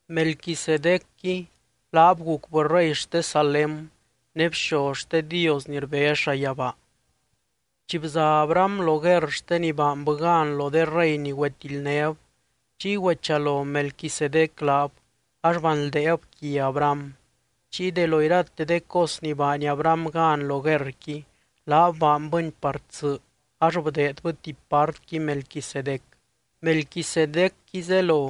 Melquisedecqui laab gucbɨ rey xte Salém ne bxoz xte Dios ni rbez llayabaa. Chi bza Abraham lo guerr xte ni baanbɨ gan lo de rey ni güetildnéb, chiy güechalo Melquisedec laab ax banldeeb quia Abraham. Chiy de lo irate de cos ni baany Abraham gan lo guerrqui, laab baanbɨni par tsɨ ax bdeedbɨ tuby partqui Melquisedec. Melquisedecqui zelo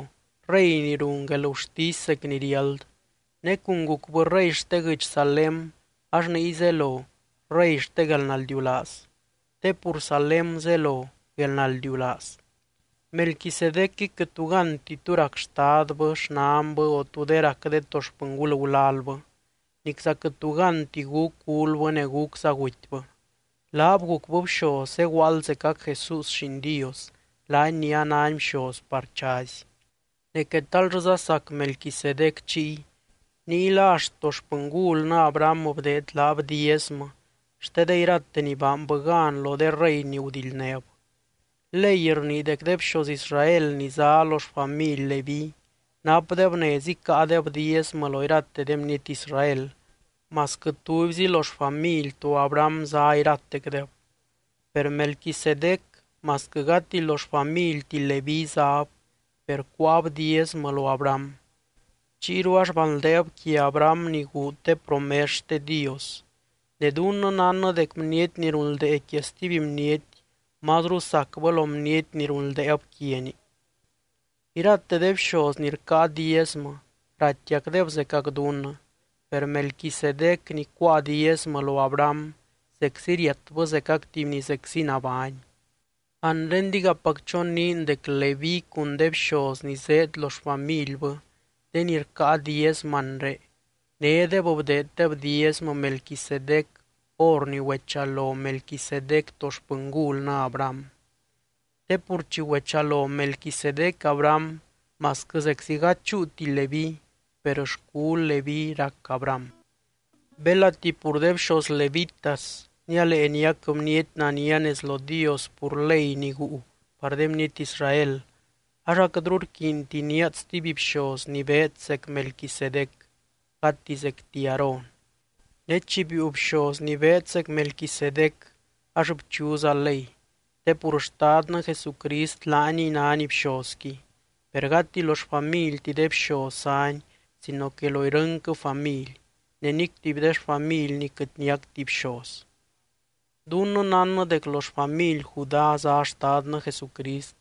“rey ni run guelgurtisy zec ni riáld.” Ne cun gucbɨ rey xte guɨdx Salém ax niy zelo “rey xte guelnaldiulaaz”, te pur Salém zelo “guelnaldiulaaz.” Melquisedecqui quɨt tu ganti tú rac xtadbɨ, xnanbɨ o tú de rac de to xpɨngul gulalbɨ. Nicza quɨt tu ganti gúc gulbɨ ne gúcza gutybɨ. Laab gucbɨ bxoz zeguaald zecac Jesús Lliin Dios, laany ni anány bxoz par chazy. Ne quetal llɨza sac Melquisedec chiy. Ninguila axt to xpɨngulnɨ Abraham bdeed laab diezmɨ xte de irate ni baanbɨ gan lo de rey ni gudildnéb. Ley rnii dec de bxoz Israel ni zá lo xfamily Leví napdeb nez icáadeb diezmɨ lo irate de bniety Israel, masquɨ tubyzi lo xfamily to Abraham zá iratecdeb. Per Melquisedec, masquɨ gati lo xfamilti Leví záb, per cuáab diezmɨ lo Abraham. Chiyru ax banldeeb quia Abraham ni guud de promes xte Dios. Ne dunnɨ nánnɨ dec bniety ni runldee quia stuby bniety, mazru sacbɨ lo bniety ni runldeeb quiani. Irate de bxoz ni rcáa diezmɨ raitiacdeb zecac dunnɨ. Per Melquisedec ni cuáa diezmɨ lo Abraham, zeczi riatbɨ zecac tuby ni zeczi nabány. Anre digapac choniin dec Leví cun de bxoz ni zéed lo xfamilbɨ de ni rcáa diezmɨ anre, nédeb bdeeddeb diezmɨ Melquisedec hor ni güechalo Melquisedec to xpɨngulnɨ Abraham. Te pur chi güechalo Melquisedec Abraham, masquɨ zeczi gady chúuti Leví, per xcul Leví rac Abraham. Belati pur de bxoz levitas nialee niac bniety nania nez lo Dios pur ley ni guu par de bniety Israel, ax aquɨtru rquiinti níaad stuby bxoz ni beed zec Melquisedec, gati zecti Aarón. Ne chi biiu bxoz ni beed zec Melquisedec ax bchuza ley, te pur Xtadnɨ Jesucrist laaniy nány bxozqui. Per gati lo xfamilti de bxoz zány sino que lo irɨnquɨ family, ne nic tuby de xfamilny quɨt niacti bxoz. Dunnɨ nánnɨ dec lo xfamily Judá zá Xtadnɨ Jesucrist,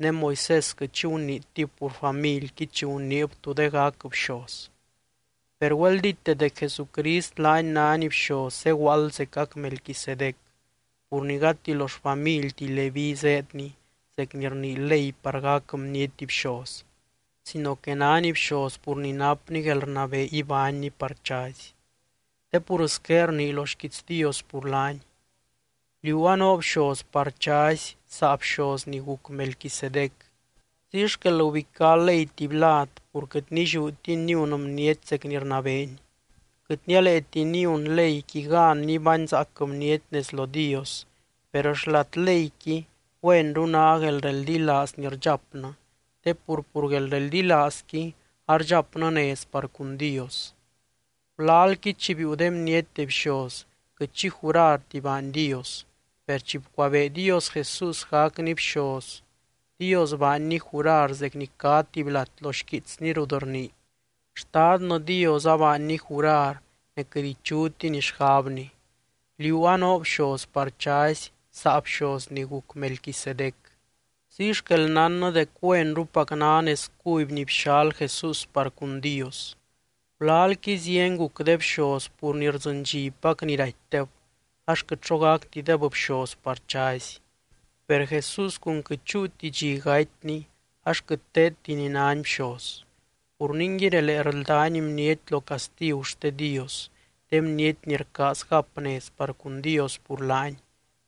ne Moisés quɨt xi guniitib pur familqui chi guniib tú de gac bxoz. Per güeldíte dec Jesucrist laany nány bxoz zeguaald zecac Melquisedec, pur ni gati lo xfamilti Leví zéedny zec ni rnii ley par gac bniety bxoz, sino que nány bxoz pur ni napny guelrnabee ibánny par chazy. Te pur squé rnii lo xquiits Dios pur laany: Liú anoo bxoz par chazy, saa bxoz ni guc Melquisedec. Ziy xquel gubicá ley tuby lad pur quɨt nilliútini niun bniety zec ni rnabeeni, (quɨt nialeeti niun leyqui gan nibányzaac bniety nez lo Dios). Per xlat leyqui, güenru ná guelreldilaaz ni rdxapnɨ, te pur, pur guelreldilaazqui ardxapnɨ nez par cun Dios. Gulalqui chi biiu de bniety de bxoz, quɨt xi jurarti baany Dios. Per chi bcuabee Dios Jesús gacny bxoz, Dios baanny jurar zec ni cá tuby lat lo xquiitsny rut rnii: Xtadnɨ Dios abaanny jurar ne quɨt ichutiny xgabny: “Liú anoo bxoz par chazy saa bxoz ni guc Melquisedec.” Ziy xquel nánnɨ dec güenrupac ná nez cuby ni bxal Jesús par cun Dios. Gulalqui zieny guc de bxoz pur ni rdzɨndxipac ni ratydeb ax quɨt xo gactideb bxoz par chazy. Per Jesús cun quɨt chúuti dxi gatyny ax quɨt teedti ni nány bxoz. Pur ningui, relee rldány bniety lo castigu xte Dios, de bniety ni rcaaz gap nez par cun Dios pur laany,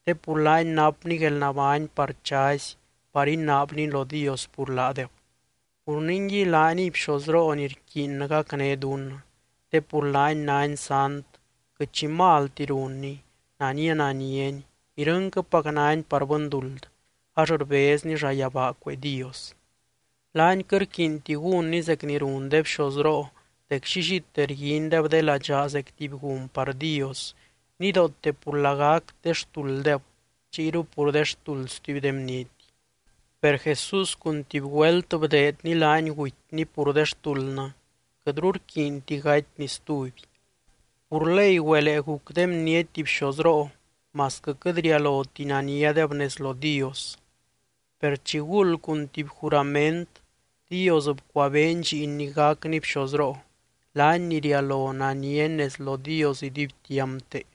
te pur laany napny guelnabány par chazy par inaabny lo Dios pur laadeb. Pur ningui laaniy bxozroo ni rquiinnɨ gacné dunnɨ. Te pur laany nány sant, quɨt xi malti runny, nania naniany, irɨnquɨpac nány par bɨnduld, ax rbezny llayabaa cuee Dios. Laany quɨt rquiinti gúnny zec ni run de bxozroo dec llillite rguindeb de ladxaa zec tuby gun par Dios, nidoote pur lagac de xtulddeb chiyru pur de xtuld stuby de bniety. Per Jesús cun tuby güelt bdeedny laany gutyny pur de xtuldnɨ, quɨtru rquiinti gatyny stuby. Pur ley güelee guc de bniety bxozroo masquɨ quɨt rialoti naniadeb nez lo Dios. Per chiguld cun tuby jurament Dios bcuabeeny Lliinny gacny bxozroo, laany ni rialo naniany nez lo Dios iduibtiampte.